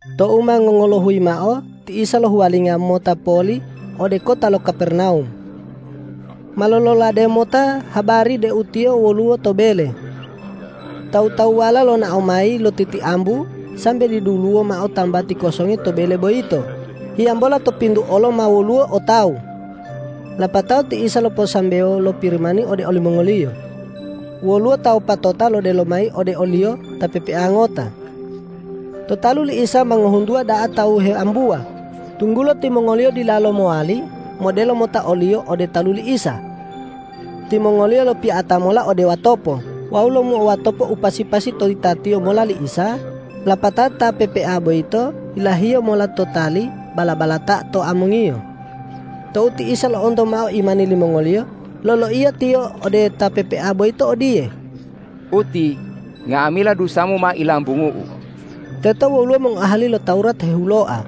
Tou ma ngongolohuyi mao ti Isa lohuwalinga mota poli ode kota lo Kapernawum. Ma lololade mota habari deu Tiyo woluwo to bele. Tawu-tawuwala lonao mayi lotitiambu sambe diduluwo mao tambati kosongi to bele boyito, hiyambola to pintu olo ma woluwo o tawu. Lapatao ti Isa loposambewo lo Pirimani ode olimongoliyo. Woluwo ta wopatota lodelo mayi ode o-Liyo ta pepea ngota. To talu li Isa ma ngohuntuwa da'a tawu heambuwa, tunggulo timongoliyo dilalo mowali modelo mota oliyo ode talu li Isa. Timongoliyo lopiya'ata mola ode watopo wawu lomuo watopa u pasi-pasi to yitatiyo mola li Isa, lapatao ta pepea boyito yilahiyo mola lo tali bala-balata to amongiyo. Tou ti Isa lo'onto mao imani limongoliyo, loloiya Tiyo ode ta pepea boyito odiye,”Uti, nga'amila dusamu ma ilambungu-U!” Teto woluwo mongoahali lo Tawurat hehuloa.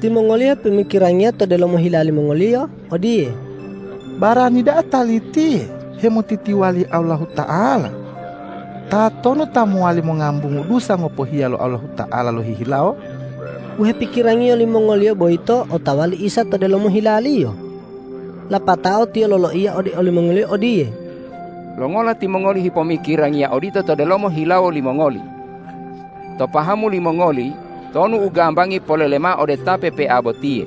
Timongoliyo hipomikirangiya to delomo hila limongoliyo odiye, ”Barani da'a Talitiye hemotitiwali Allahuta'ala. Tatonu ta mowali mongambungu dusa ngopohiya lo Allahuta'ala lohihilawo?” U hepikirangiyo limongoliyo boyito otawa li Isa to delomo hila-Liyo. Lapatao Tiyo loloiya ode olimongoliyo odiye,”Longola timongoli hipomikirangiya odito to delomo hilawo limongoli? To pahamu limongoli, tonu u gambangi polele mao ode ta pepea botiye,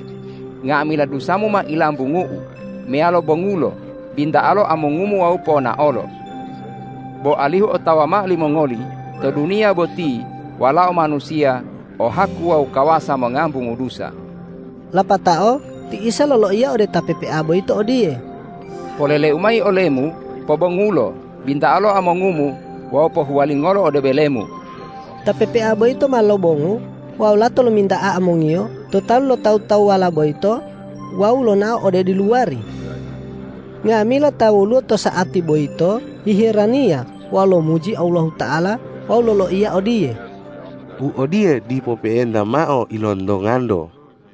nga'amila dusamu ma ilambungu-U, meyalo bongulo, binta'alo amongumu wawu ponaolo? Bo alihu otawa mao limongoli to duniya boti Walao Manusiya o haku wawu kawasa mongambungu dusa.” Lapatao ti Isa loloiya ode ta pepea boyito odiye, ”Polele-U mayi olemu: Pobongulo, binta'alo amongumu wawu pohuwalingolo ode belemu!” Ta pepea boyito ma lobongu wawu lato lominta'a amongiyo to talu lo tawu-tawuwala boyito wawu lonao ode diluwari. Nga'amila ta woluwo to sa'ati boyito hiheraniya wawu lomuji Allahuta'ala wawu loloiya odiye,”U odiye dipo pe'enta mao ilontonganto.”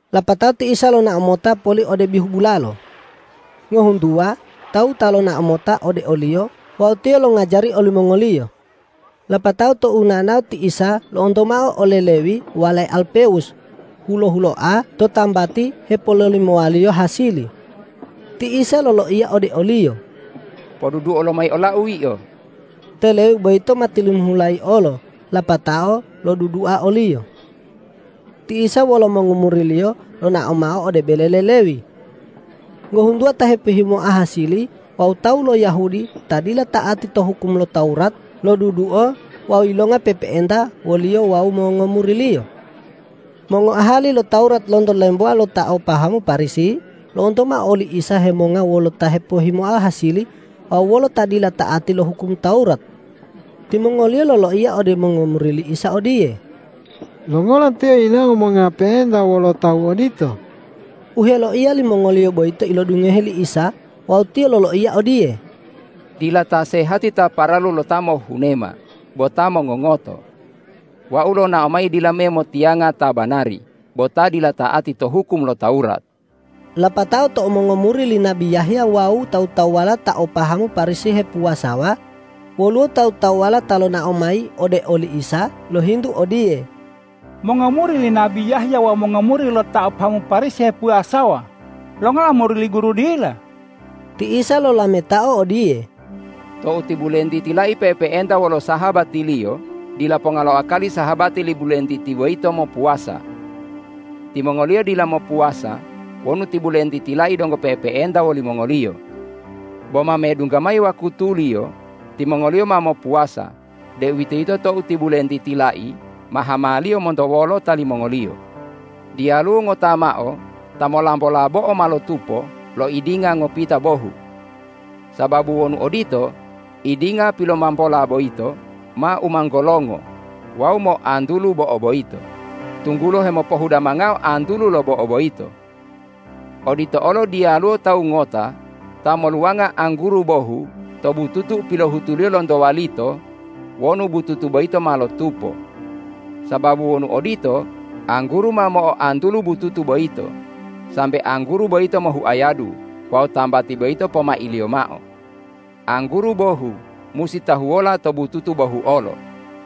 Lapatao ti Isa lonao mota poli ode bihu bulalo. Ngohuntuwa tawu ta lonao mota ode o-Liyo wawu Tiyo longajari olimongoliyo. Lapatao tou nao-nao ti Isa lo'onto mao ole Lewi walae Alpewus hulo-huloa to tambati hepololimowaliyo hasili. Ti Isa loloiya ode oliyo,”Poduduo lomayi ola-U yio!” Te Lewi boyito ma tilimihulayi olo lapatao lodudua o-Liyo. Ti Isa wolo mongomuri-Liyo lonao mao ode bele le Lewi. Ngohuntuwa ta hepohhimoa hasili wawu tawu lo Yahudi ta dila ta'ati to hukum lo Tawurat, loduduo wawu yilonga pe'epe'enta wo-Liyo wawu mongomuri-Liyo. Mongoahali lo Tawurat lonto lemboa lo ta o pahamu Parisi lo'onto mao oli Isa hemonga wolo ta hepohhimoa hasili wawu wolo ta dila ta'ati to hukum lo Tawurat. Timongoliyo loloiya ode mongomuri li Isa odiye,”Longola Tiyo yinawo monga pe'enta wolo tawu odito?” U heloiya limongoliyo boyito ilodungohe li Isa wawu Tiyo loloiya odiye,”Dila ta sehati ta paralu lo ta mohhunema bo ta mongongoto. Wau lonao mayi dila me motiyanga ta banari bo ta dila ta'ati to hukum lo Tawurat.” Lapatao tou mongomuri li nabi Yahya wawu tawu-tawuwala ta o pahamu Parisi hepuwasawa, woluwo tawu-tawuwala ta lonao mayi ode oli Isa lohintu odiye,”Mongomuri li nabi Yahya wawu mongomuri lo ta o pahamu Parisi hepuwasawa. Longola mongomuri li Guru dila?” Ti Isa lolametao odiye,”Tou ti bulentiti lai pe'epe'enta wolo sahabatiliyo, dila ponga lo akali sahabati li bulentiti boyito mopuwasa. Timongoliyo dila mopuwasa wonu ti bulentiti lai donggo pe'epe'enta wolimongoliyo. Bo ma medungga mayi wakutuliyo, timongoliyo ma mopuwasa, deuwitoyito tou ti bulentiti lai ma hamaliyo monto wolota limongoliyo. Diyaluwo ngota mao ta molambola bo'o ma lotupo lo idinga ngopita bohu. Sababu wonu odito, idinga pilomambola boyito ma umanggolongo wawu mo'oantulu bo'o boyito, tunggulo hemopohudamangao antulu lo bo'o boyito. Odito olo diyaluwo tawu ngota ta moluwanga angguru bohu to bututu u pilohutuliyo lonto walito wonu bututu boyito ma lotupo. Sababu wonu odito, angguru ma mo'oantulu bututu boyito, sambe angguru boyito mohuayadu wawu tambati boyito pomailiyo mao. Angguru bohu musi tahuwola to bututu bohu olo.”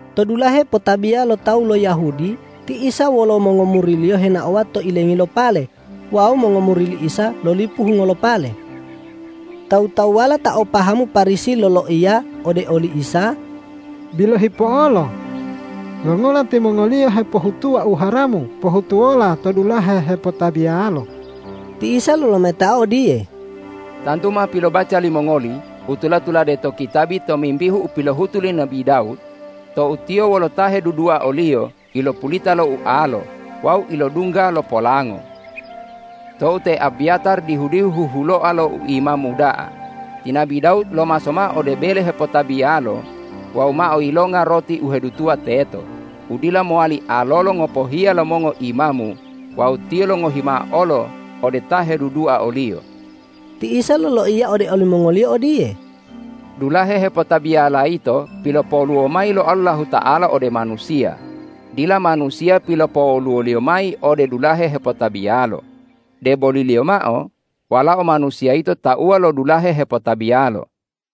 To dulahe hepotabiya lo tawu lo Yahudi ti Isa wolo mongomuri-Liyo henaowa to ilengi lo pale wawu mongomuri li Isa lolipu hungo lo pale. Tawu-tawuwala ta o pahamu Parisi loloiya ode oli Isa,”Bilohi po'olo! Longola timongoliyo hepohutuwa u haramu pohutuwola to dulahe hepotabiyalo?” Ti Isa lolametao odiye,”Tantu ma pilobaca limongoli u tula-tulade to kitabi tomimbihu u pilohutu li nabi Dawud tou tiyo wolo ta hedudua oliyo ilopulita lo ualo wawu ilodungga lo polango. Tou te Abyatar dihu-dihu huhuloa lo u imamu da'a, ti nabi Dawud lomaso mao ode bele hepotabiyalo wawu mao yilonga roti u hedutuwa teto, u dila mowali alolo ngopohiya lo mongoimamu wawu tiyo longohi mao olo ode ta hedudua oliyo.” Ti Isa loloiya ode olimongoliyo odiye,”Dulahe hepotabiyala yito pilopowoluwo mayi lo Allahuta'ala ode manusiya, dila manusiya pilopowoluwo-Liyo mayi ode dulahe hepotabiyalo, deboliliyo mao Walao Manusiya yito tauwa lo dulahe hepotabiyalo.”